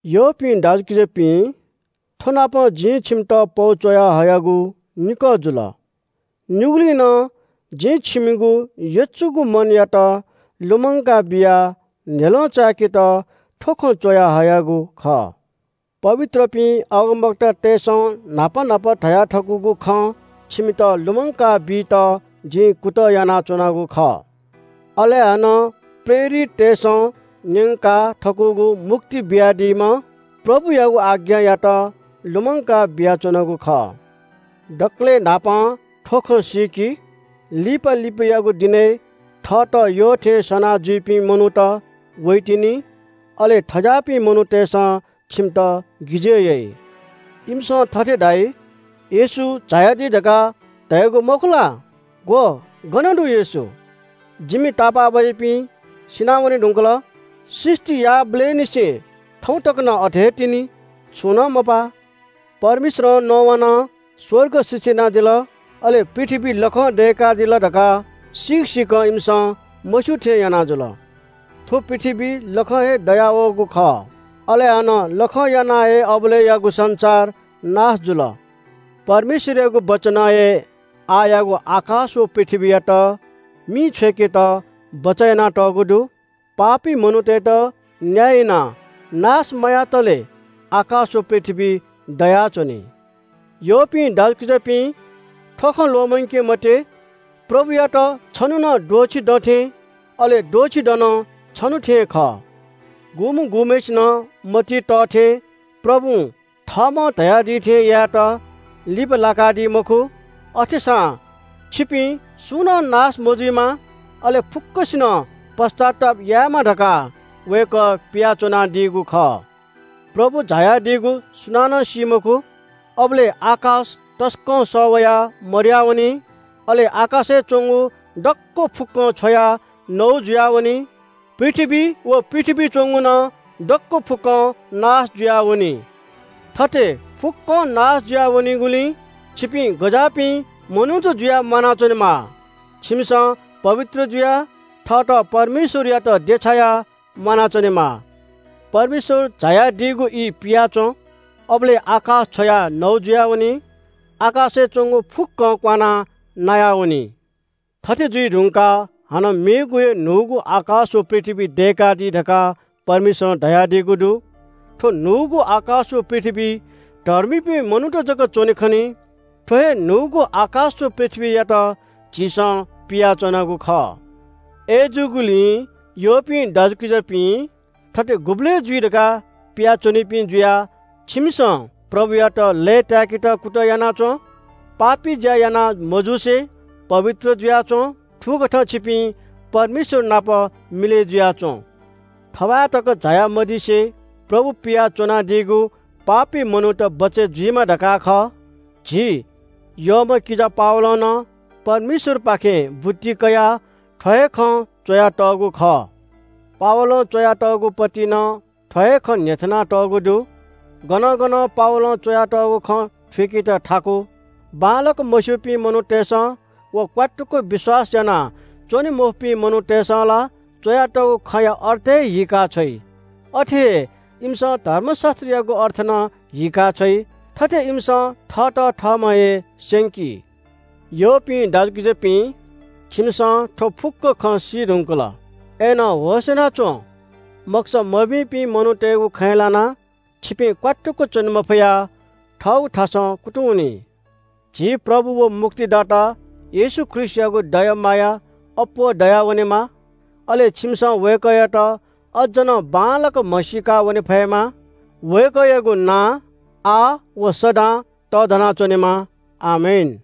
यःपिं दाजुकिजापिं, थ्‍वनापं जिं छिमित पौ च्‍वयाहयागु निकः जुल। निगुली नं जिं छिमिगु यचुगु मनयात लुमंका बियाः न्‍ह्यलं चाय्‌केत थ्‍व खँ च्‍वयाहयागु खः। पवित्रपिं अगमवक्तातय्‌सं न्‍हापा न्‍हापा धयाथकूगु खँ छिमित लुमंकाबीत जिं कुतः यानाच्‍वनागु खः। अले हानं प्रेरिततय्‌सं न्‍यंका थकूगु मुक्ति बियादीम्‍ह प्रभुयागु आज्ञायात लुमंका बियाच्‍वनागु खः। दकलय् न्‍हापां थ्‍व खँ सीकि, लिपा लिपायागु दिनय् थःत यःथें सना जुइपिं मनूत वइतिनि। अले थज्‍याःपिं मनूतय्‌सं छिमित गिजय् याइ। इमिसं थथे धाइ – “येशू झायादी धकाः धयागु मखु ला? ग्‍व, गन दु येशू? जिमि तापाःबाज्‍यापिं सिनावने धुंकल। सृष्‍टि याःबलय् निसें थौं तक नं अथे हे तिनि, छुं नं मपाः।” परमेश्‍वरं नवानाः स्‍वर्ग सृष्‍टि यानादिल, अले पृथ्‍वी लखं दय्‌कादिल धकाः सीक सीकं इमिसं मस्‍यू थें याना जुल। थ्‍व पृथ्‍वी लखं हे दयावःगु खः, अले हानं लखं यानाः हे अबलय्‌यागु संसार नाश जुल। परमेश्‍वरयागु वचनं हे आःयागु आकाश व पृथ्‍वीयात मिइ छ्वय्‌केत बचय् यानातःगु दु। पापी मनूतय्‌त न्‍याय यानाः नाश मयातले आकाश व पृथ्‍वी दयाच्‍वनी। यःपिं दाजुकिजापिं, थ्‍व खँ ल्‍वःमंके मते – प्रभुयात छन्‍हु नं द्वःछि दँ थें, अले द्वःछि दँ नं छन्‍हु थें खः। गुम्‍ह गुम्‍हय्‌सिनं मतिइ तः थें प्रभुं थःम्‍हं धयादी थें यायेत लिपा लाकादी मखु। अथेसां छिपिं सुं नं नाश मजुइमा, अले फुक्‍कसिनं पश्‍चाताप यायेमा धकाः वय्‌कः पियाच्‍वनादीगु खः। प्रभु झायादीगु सुनानं सी मखु। अबलय् आकाश तसकं सः वयाः मदयावनी। अले आकाशय् च्‍वंगु दक्‍व फुक्‍कं छ्वयाः नौ जुयावनी। पृथ्‍वी व पृथ्‍वीइ च्‍वंगु नं दक्‍व फुक्‍कं नाश जुयावनी। थथे फुक्‍कं नाश जुया वनीगुलिं छिपिं गज्‍याःपिं मनूत जुयाः म्‍वानाच्‍वनेमाः? छिमिसं पवित्र जुयाः, थःत परमेश्‍वरयात देछायाः म्‍वानाच्‍वनेमाः। परमेश्‍वर झायादीगु ई पियाच्‍वँ। अबलय् आकाश छ्वयाः नौ जुयावनी। आकाशय् च्‍वंगु फुक्‍कं क्‍वानाः नायावनी। थथे जुइ धुंकाः हानं मेगु हे न्‍हूगु आकाश व पृथ्‍वी दय्‌कादी धकाः परमेश्‍वरं धयादीगु दु। थ्‍व न्‍हूगु आकाश व पृथ्‍वीइ धर्मीपिं मनूत जक च्‍वने खनी। थ्‍व हे न्‍हूगु आकाश व पृथ्‍वीयात झीसं पियाच्‍वनागु खः। अय्‌जूगुलिं यःपिं दाजुकिजापिं, थथे गुबलय् जुइ धकाः पिया च्‍वनीपिं जुयाः छिमिसं प्रभुयात लय्‌ताय्‌केत कुतः याना च्‍वँ। पापी ज्‍या याना मजुसे पवित्र जुयाच्‍वँ। थुकथं छिपिं परमेश्‍वर नाप मिलय् जुयाच्‍वँ। थौं तक झाया मदिसे प्रभु पियाच्‍वनादीगु पापी मनूत बचय् जुइमा धकाः खः। झी यःम्‍ह किजा पावलं नं परमेश्‍वरपाखें बुद्धि कयाः थ्‍व हे खँ च्‍वयातःगु खः। पावलं च्‍वयातःगु पौलय्‌ नं थ्‍व हे खँ न्‍ह्यथनातःगु दु। गनं गनं पावलं च्‍वयातःगु खँ थुइकेत थाकु। बांलाक मस्‍यूपिं मनूतय्‌सं व क्‍वात्तुक विश्‍वास यानाच्‍वने मफुपिं मनूतय्‌सं ला च्‍वयातःगु खँया अर्थ हे हीका छ्वइ। थथे हे इमिसं धर्मशास्‍त्रयागु अर्थ नं हीका छ्वइ। थथे इमिसं थःत थःम्‍हं हे स्‍यंकी। यःपिं दाजुकिजापिं, छिमिसं थ्‍व फुक्‍क खँ सी धुंकल, अय्‌नं होश‍ यानाच्‍वँ। मखुसा मभिंपिं मनूतय्‌गु खँय् लानाः छिपिं क्‍वात्तुक च्‍वने मफयाः थःगु थासं कुतुं वनी। झी प्रभु व मुक्तिदाता येशू ख्रीष्‍टयागु दया माया अप्‍वः दयावनेमा। अले छिमिसं वय्‌कःयात अझ नं बांलाक म्‍हसीका वने फयेमा। वय्‌कःयागु नां आः व सदां तःधना च्‍वनेमा। आमेन।